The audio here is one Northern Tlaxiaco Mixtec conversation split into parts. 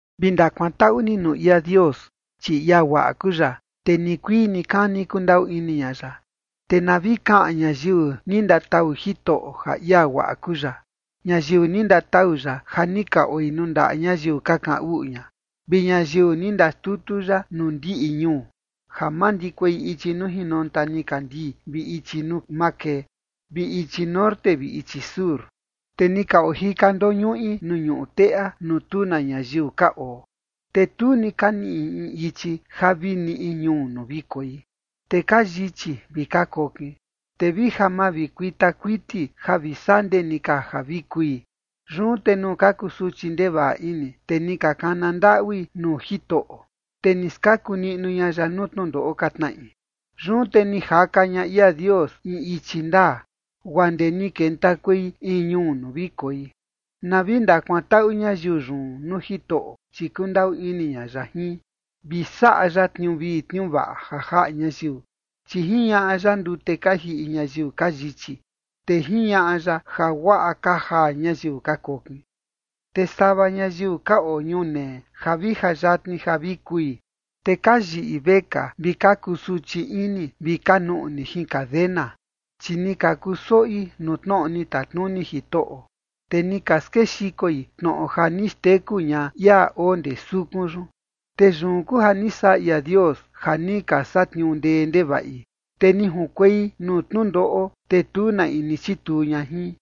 Vi ndakuantaꞌu ni nuu ia Dios, chi ia guaꞌa kuu ya, te nikuii nikani kundaꞌu ini ña ya. Te na vi kaꞌan ñayiu ni ndatau Jitoꞌo ja ia guaꞌa kuu ya, ñayiu ni ndatau ya ja ni ka oi nuu ndaꞌa ñayiu ka kaꞌan uꞌu ña, vi ñayiu ni ndaxtutu ya nuu ndiꞌi ñuu, ja mandikuei ichi nuu jinonta nikandii vi ichi nuu makee, vi ichi norte vi ichi sur. Te ni ka ojika ndoñuꞌi nuu ñuꞌu teꞌa nuu tu na ñayiu ka oo, te tu ni ka niꞌi in ichi ja vi niꞌi in ñuu nuu vi koi. Te ka yichi vi ka kokin, te vi ja mavikuita kuiti ja vi sandee ni ka ja vi kui. Yun te nuu ka kusuchi ndevaꞌa ini, te ni ka kana ndaꞌui nuu Jitoꞌo, te ni skaku niꞌnu ña ya nuu tnundoꞌo ka tnaꞌi. Yun te ni jaka ña ia Dios in ichi ndaa guaa ndee ni kentakuei in ñuu nuu vi koi. Na vi ndakuantaꞌu ñayiu yun nuu Jitoꞌo, chi kundaꞌu ini ña ya jin, vi saꞌa ya tniuu vii tniuu vaꞌa ja jaꞌa ñayiu. Chi jiñaꞌa ya ndute ka jiꞌi ñayiu ka yichi, te jiñaꞌa ya ja guaꞌa ka jaa ñayiu ka kokin. Te sava ñayiu ka oo ñunee ja vi ja yatni ja vi kui, te ka yiꞌi vekaa vi ka kusuchi ini vi ka nuꞌni jin cadena. Chi ni ka kusoꞌi nuu tnoꞌo ni tatnuni Jitoꞌo, te ni ka skexikoi tnoꞌo ja ni xteku ña ia oo ndee sukun yun. Te yun kuu ja ni saꞌa ia Dios ja ni ka satniuu ndee ndevaꞌi, te ni junkuei nuu tnundoꞌo, te tu na in ni chituu ña jin.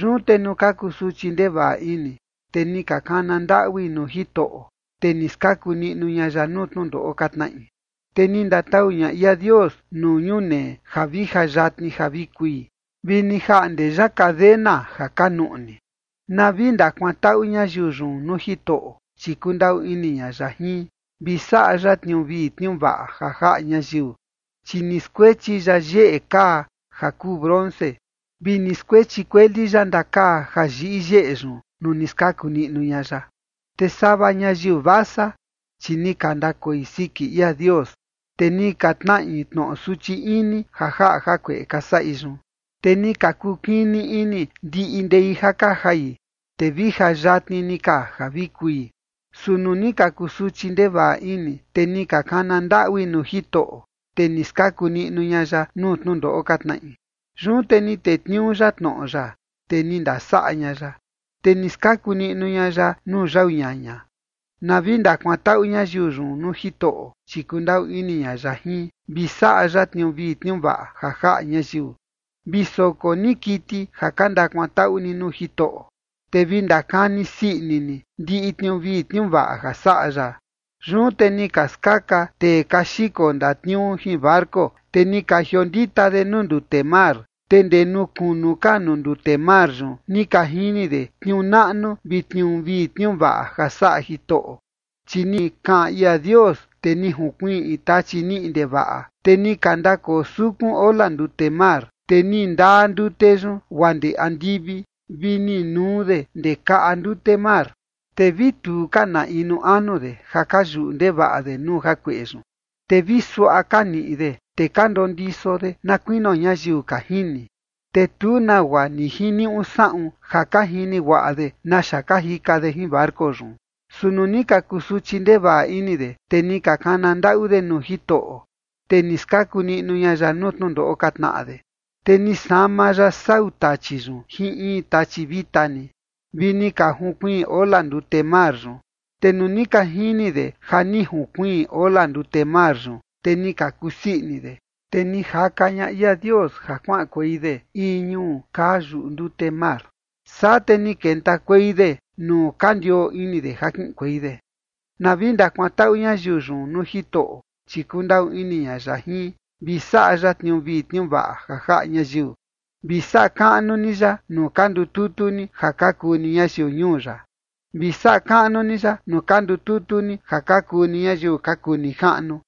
Yun te nuu ka kusuchi ndevaꞌa ini, te ni ka kana ndaꞌui nuu Jitoꞌo, te ni skaku niꞌnu ña ya nuu tnundoꞌo ka tnaꞌi. Te ni ndatau ña ia Dios nuu ñunee ja vi ja yatni ja vi kui vi ni jaꞌnde ya cadena ja ka nuꞌni. Na vi ndakuantaꞌu ñayiu yun nuu Jitoꞌo, chi kundaꞌu ini ña ya jin, vi saꞌa ya tniuu vii tniuu vaꞌa ja jaꞌa ñayiu. Chi ni skuechi ya yeꞌe kaa ja kuu bronce, vi ni skuechi kueli ya ndakaa ja yiꞌi yeꞌe yun nuu ni skaku niꞌnu ña ya. Te sava ñayiu vasa, chi ni ka ndakoi siki ia Dios, te ni ka tnaꞌi tnoꞌo suchi ini ja jaꞌa jakueꞌe ka saꞌi yun. Te ni ka kukini ini ndiꞌi ndei ja ka jai, te vi ja yatni ni ka ja vi kui. Su nuu ni ka kusuchi ndevaꞌa ini, te ni ka kana ndaꞌui nuu Jitoꞌo, te ni skaku niꞌnu ña ya nuu tnundoꞌo ka tnaꞌi. Yun te ni tetniuu ya tnoꞌo ya, te ni ndasaꞌa ña ya, te ni skaku niꞌnu ña ya nuu yau ñaña. Na vi ndakuantaꞌu ñayiu yun nuu Jitoꞌo, chi kundaꞌu ini ña ya jin, vi saꞌa ya tniuu vii tniuu vaꞌa ja jaꞌa ñayiu. Vi soko ni kiti ja ka ndakuantaꞌu ni nuu Jitoꞌo, te vi ndakani sii ini ni ndiꞌi tniuu vii tniuu vaꞌa ja saꞌa ya. Yun te ni ka skaka tee ka xiko ndatniuu jin barco, te ni ka jiondita de nuu ndute mar. Te ndee nuu kunu ka nuu ndute mar yun ni ka jini de tniuu naꞌnu vi tniuu vii tniuu vaꞌa ja saꞌa Jitoꞌo. Chi ni kaꞌan ia Dios, te ni junkiꞌi in tachi niꞌi ndevaꞌa, te ni ka ndakoo sukun ola ndute mar, te ni ndaa ndute yun guaa ndee andivi, vi ni nuu de ndee kaꞌa ndute mar. Te vi tu ka na inu anu de ja ka yuꞌu ndevaꞌa de nuu jakueꞌe yun. Te vi suaꞌa ka niꞌi de, te ka ndondiso de na kuinio ñayiu ka jini, te tu nagua ni jiniuꞌu saꞌun ja ka jini guaꞌa de naxa ka jika de jin barco yun. Su nuu ni ka kusuchi ndevaꞌa ini de, te ni ka kana ndaꞌu de nuu Jitoꞌo, te ni skaku niꞌnu ña ya nuu tnundoꞌo ka tnaꞌa de. Te ni sama ya sau tachi yun jin in tachi vita ni, vi ni ka junkuiin ola ndute mar yun. Te nuu ni ka jini de ja ni junkuiin ola ndute mar yun, te ni ka kusii ini de. Te ni jaka ña ia Dios ja kuaꞌankuei de in ñuu kaa yuꞌu ndute mar, saa te ni kentakuei de nuu ka ndioo ini de ja kiꞌinkuei de. Na vi ndakuantaꞌu ñayiu yun nuu Jitoꞌo, chi kundaꞌu ini ña ya jin, vi saꞌa ya tniuu vii tniuu vaꞌa ja jaꞌa ñayiu. Vi saꞌa kaꞌnu ni ya nuu ka ndututu ni ja ka kuu ni ñayiu ñuu ya. Vi saꞌa kaꞌnu ni ya nuu ka ndututu ni ja ka kuu ni ñayiu ka kuu nijaꞌnu.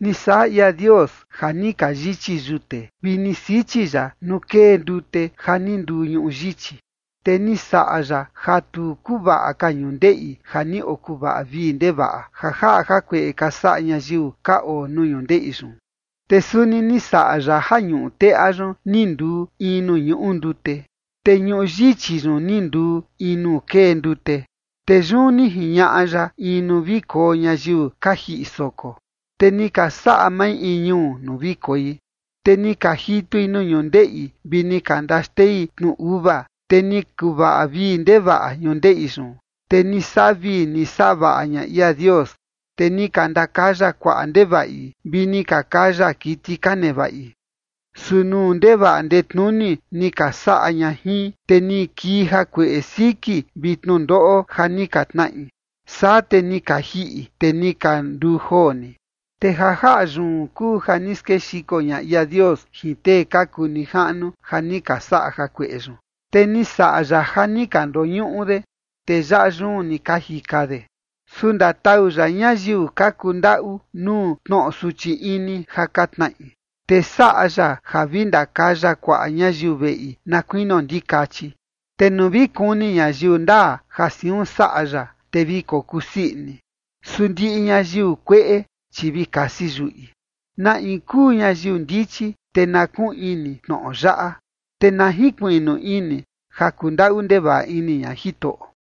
Ni saꞌa ia Dios ja ni ka yichi yute, vi ni sichi ya nuu kee ndute ja ni nduu ñuꞌu yichi. Te ni saꞌa ya ja tu kuvaꞌa ka ñundeꞌi ja ni okuvaꞌa vii ndevaꞌa, ja jaꞌa jakueꞌe ka saꞌa ñayiu ka oo nuu ñundeꞌi yun. Te suni ni saꞌa ya ja ñuꞌu teꞌa yun ni nduu in nuu ñuꞌu ndute, te ñuꞌu yichi yun ni nduu in nuu kee ndute. Te yun ni jiñaꞌa ya in nuu vi koo ñayiu ka jiꞌi soko, te ni ka saꞌa mai in ñuu nuu vi koi. Te ni ka jitui nuu ñundeꞌi vi ni ka ndaxtei tnu uva, te ni kuvaꞌa vii ndevaꞌa ñundeꞌi yun. Te ni saꞌa vii ni saꞌa vaꞌa ña ia Dios, te ni ka ndakaya kuaꞌa ndevaꞌi, vi ni ka kaya kiti ka nevaꞌi. Su nuu ndevaꞌa ndetnuni ni ka saꞌa ña jin, te ni kii jakueꞌe siki vi tnundoꞌo ja ni ka tnaꞌi, saa te ni ka jiꞌi, te ni ka nduu joo ni. Te ja jaꞌa yun kuu ja ni skexiko ña ia Dios jin tee ka kuu nijaꞌnu ja ni ka saꞌa jakueꞌe yun, te ni saꞌa ya ja ni ka ndoñuꞌu de, te yaꞌa yun ni ka jika de. Su ndatau ya ñayiu ka kundaꞌu nuu tnoꞌo suchi ini ja ka tnaꞌi, te saꞌa ya ja vi ndakaya kuaꞌa ñayiu veꞌi na kuinio ndikachi. Te nuu vi kuni ñayiu ndaa ja siun saꞌa ya, te vi kokusii ini, su ndiꞌi ñayiu kueꞌe, chi vi kasi yuꞌi. Na in kuu ñayiu ndichi, te na kuꞌun ini tnoꞌo yaꞌa, te na jinkuiꞌnu ini ja kundaꞌu ndevaꞌa ini ña Jitoꞌo.